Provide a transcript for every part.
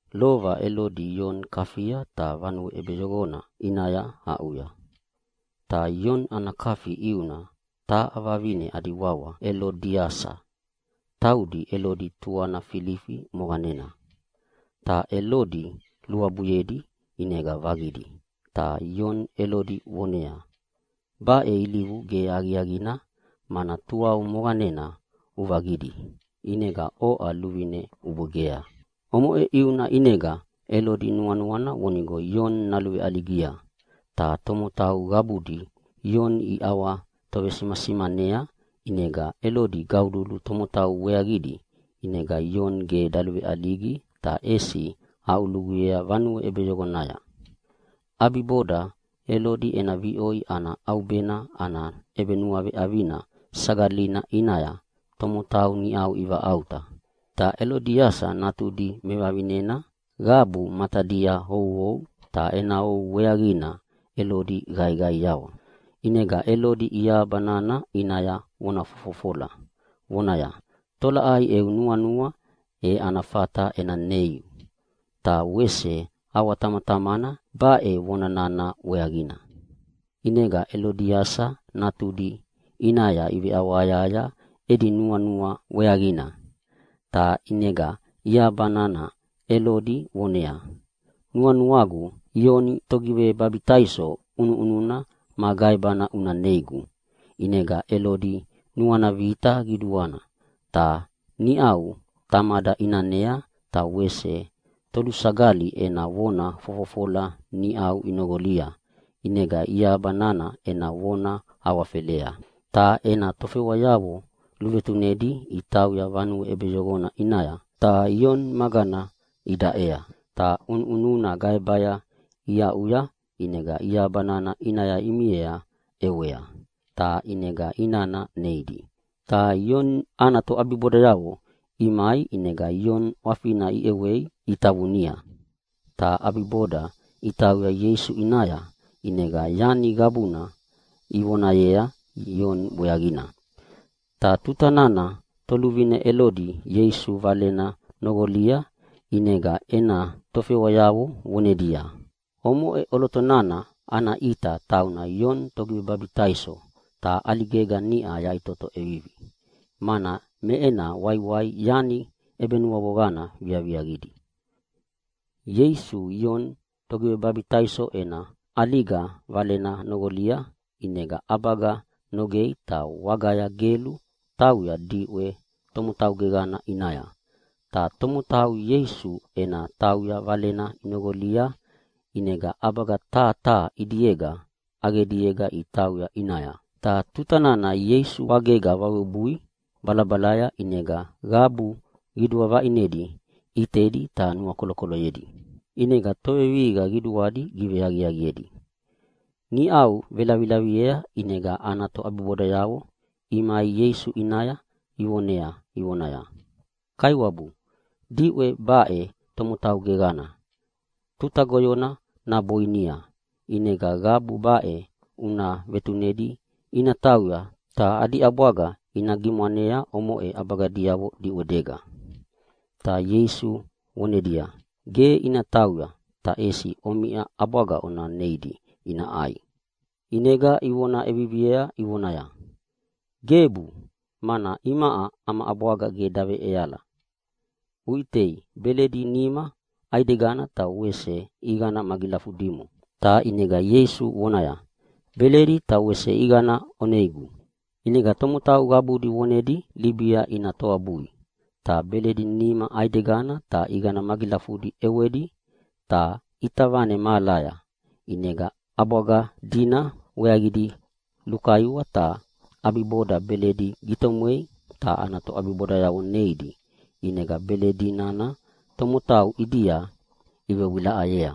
Lova Elodi Ioni kafia ta vanue ʼebeyoqona ʼinaya aʼuya. Ta Ioni ana kafi ʼiuna taha vavine adi wawa Elodiasa, taudi Elodi tuana Filifi moqanena. Ta Elodi luabuyedi ʼinega vaqidi ta Ioni Elodi voneaya, “Baʼe ge ilivu aqiaqina mana tuau moqanena uvaqidi, ʼinega oʼa luvine ubwegea!” Omoʼe ʼiuna ʼinega Elodi nuanuana vonigo Ioni naluveʼaligia, ta tomotau qabudi Ioni iʼawatovesimasimanea ʼinega Elodi gaululu tomotau weaqidi ʼinega Ioni ge daluveʼaligi ta ʼesi aʼuluguyea vanue ʼebeyoqonaya. ʼAbiboda Elodi ena viʼoi ana ʼaubena ana ʼebenuaveʼavina sagalina ʼinaya tomotau niʼa ivaʼauta, ta Elodiasa natudi mevavinena qabu matadia ouou, ta ena ou weaqina Elodi qaiqaiawa. ʼInega Elodi iahaba nana ʼinaya vona fofofola vonaya, “Tolaʼai eu nuanua e ana fata ena neiu”, ta wese ʼawatamatamana baʼe vona nana weaqina. ʼInega Elodiasa natudi ʼinaya iveʼawahayahaya edi nuanua weaqina, ta ʼinega iahabana Elodi voneaya, “Nuanuagu Ioni Togivebabitaiso ʼunuʼununa ma gaebana una neigu.” ʼInega Elodi nuana vita qiduana, ta niʼa tamada ʼinanea ta wese tolusagali ena vona fofofola niʼa inoqolia ʼinega iahaba nana ena vona awafelea. Ta ena tofewayavo luvetunedi itauya vanue ʼebeyoqona ʼinaya, ta Ioni magana idaʼea. Ta ʼunuʼununa gaebaya iaʼuya ʼinega iahabana ʼinaya imiea ʼewea, ta ʼinega inana neidi. Ta Ioni ana toʼabibodayavo imai ʼinega Ioni ʼwafina iʼewei itavunia. Ta ʼabiboda itauya Ieisu ʼinaya, ʼinega yani qabuna ivonayea Ioni weaqina. Ta tuta nana toluvine Elodi Ieisu Valena noqolia, ʼinega ena tofewayavo vonedia, “Omoʼe ʼoloto nana ana ʼita tauna Ioni Togivebabitaiso ta ʼaligega niʼa yaʼitoto ʼevivi, mana me ena waiwai yani ʼebenuavoqana viaviaqidi.” Ieisu Ioni Togivebabitaiso ena ʼaliga valena noqolia, ʼinega ʼabaga nogea ta wagaya gelu tauya diʼwe tomotau geqana ʼinaya. Ta tomotau Ieisu ena tauya valena inoqolia, ʼinega ʼabaga taha taha ʼidiega ʼaqediega itauya ʼinaya. Ta tuta nana Ieisu wagega vawebui balabalaya ʼinega qabu qidua vaʼinedi ʼitedi ta nuakolokoloyedi. ʼInega tovevihiqa qabudi giveaqiaqiedi. Niʼa velavilaviea ʼinega ana toʼabibodayavo imai Ieisu ʼinaya ivonea ivonaya, “Kaiwabu, diʼwe baʼena tomotau geqana, tuta goyona naboinia ʼinega qabu baʼe una vetunedi ina tauya, ta adi ʼabwaga ina gimwane omoʼe ʼabaganavo diʼwedega.” Ta Ieisu vonedia, “Ge ina tauya, ta ʼesi omiʼa ʼabwaga ona neidi ina ʼai.” ʼInega ivona ʼeviviea ivonaya, “Gebu, mana imaʼa ama ʼabwaga ge ʼeala, uʼitei beledi nima ʼaidegana ta wese ʼiqana magilafudimo.” Ta ʼinega Ieisu vonaya, “Beledi ta wese ʼiqana oneigu!” ʼInega tomotau qabudi vonedi libia ina toabui ta beledi nima ʼaidegana ta ʼiqana magilafudi ʼewedi ta ʼita vane mahalaya, ʼinega ʼabwaga dina weaqidi lukaiwa. Ta ʼabiboda beledi gitomwedi ta ana toʼabibodayavo neidi, ʼinega beledi nana tomotau ʼidia ivewilaʼayea.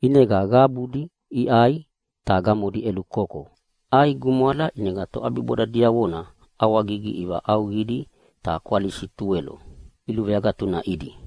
ʼInega qabudi iʼai ta gamodi ʼelukoko. ʼAi gumwala, ʼinega toʼabiboda diavona ʼawagigi ivaʼauqidi, ta kwalisi tuwelo iluveagatunaʼidi.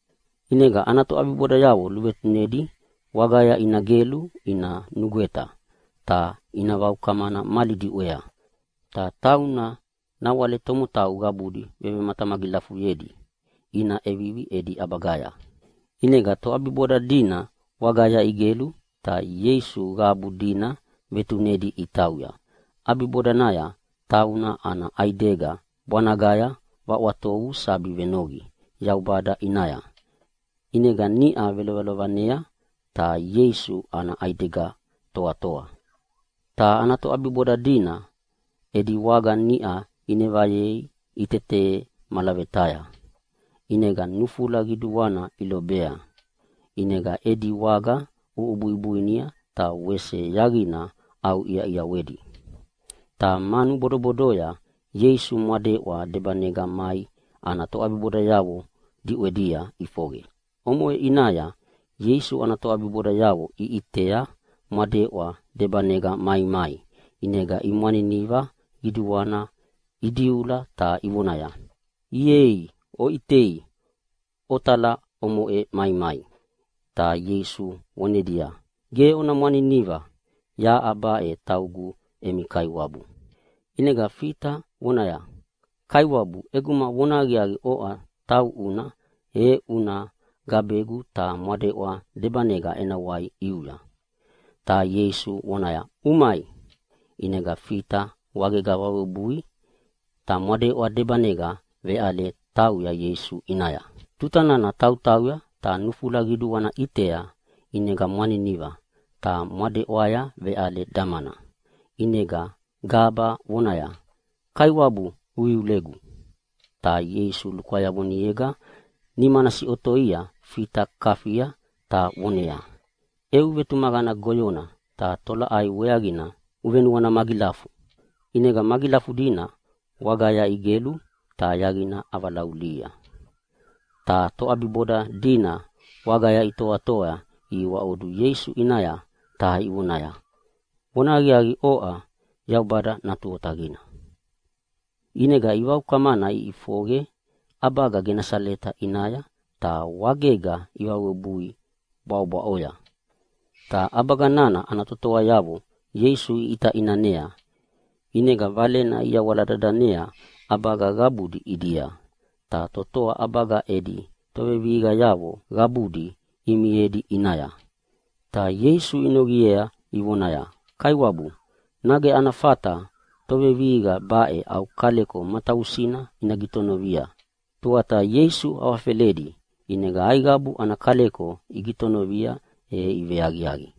ʼInega ana toʼabibodayavo luvetunedi wagaya ina igelu ina nugweta ta ina vaukamana mali diʼwea. Ta tauna nawale tomotau qabudi vevematamagilafuyedi ina ʼevivi edi ʼabagaya. ʼInega toʼabiboda dina wagaya igelu ta Ieisu qabu dina vetunedi itauya. ʼAbibodanaya tauna ana ʼaidega bwanagaya ʼwatovu sabi venoqi Yaubada ʼinaya. ʼInega niʼa velovelovanea ta Ieisu ana ʼaidega toatoa. Ta toʼabiboda dina edi waga niʼa inevayei itete malavetaya, ʼinega nufula qiduana ilobea. ʼInega edi waga ʼubuibuinia ta wese yaqina ʼauʼiaʼiawedi. Ta manu bodobodoya Ieisu mwadeʼwa debanega mai ana toʼabibodayavo diʼwedia ʼifoqe. Omoʼe ʼinaya Ieisu ana toʼabibodayavo iʼitea mwadeʼwa debanega maimai ʼinega imwaniniva qiduana idiula ta ivonaya, “Ieii, oʼitei otala omoʼe maimai!” Ta Ieisu vonedia, “Ge ona mwaniniva, yaʼa baʼe taugu emi Kaiwabu.” ʼInega Fita vonaya, “Kaiwabu, ʼeguma vonahaqiaqi oʼa tauʼuna e ʼinega una gabegu ta mwadeʼwa debanega ena wai ʼiuya.” Ta Ieisu voneaya, “Umai!” ʼinega Fita wagega vawebui ta mwadeʼwa debanega veʼale natauya Ieisu ʼinaya. Tuta nana tautauya ta nufula qiduana ʼitea ʼinega mwaniniva ta mwadeʼwaya veʼale damana ʼinega gaba vonaya, “Kaiwabu, uiulegu!” ʼInega Ieisu lukwayavonega nimana siʼotoia Fita kafia ta voneaya, “Eu vetumaqana goyona, tolaʼai weaqina uvenuana magilafu?” ʼInega magilafudi wagaya igelu ta yaqina ʼavalaulihia. Ta toʼabiboda dina wagaya itoatoa ihiwaʼodu Ieisu ʼinaya ta ivonaya, “Vonahaqiaqi, oʼa Yaubada Natu Otaqina.” ʼInega ivaukamana iʼifoqe ʼabaga Genasaleta ʼinaya ta wagega ivawebui bwaʼobwaʼoya. Ta ʼabaga nana ana totoayavo Ieisu iʼita ʼinanea, ʼinega valena iyawala dadanea ʼabaga qabudi ʼidia, ta totoa ʼabaga edi tovevihiqayavo qabudi imiedi ʼinaya. Ta Ieisu inoqiea ivonaya, “Kaiwabu, nage ana fata tovevihiqa baʼe au kaleko matavusina ina gitonovia?” Tuata Ieisu awafeledi, ʼinega aiqabu ana kaleko igitonovia e iveaqiaqi.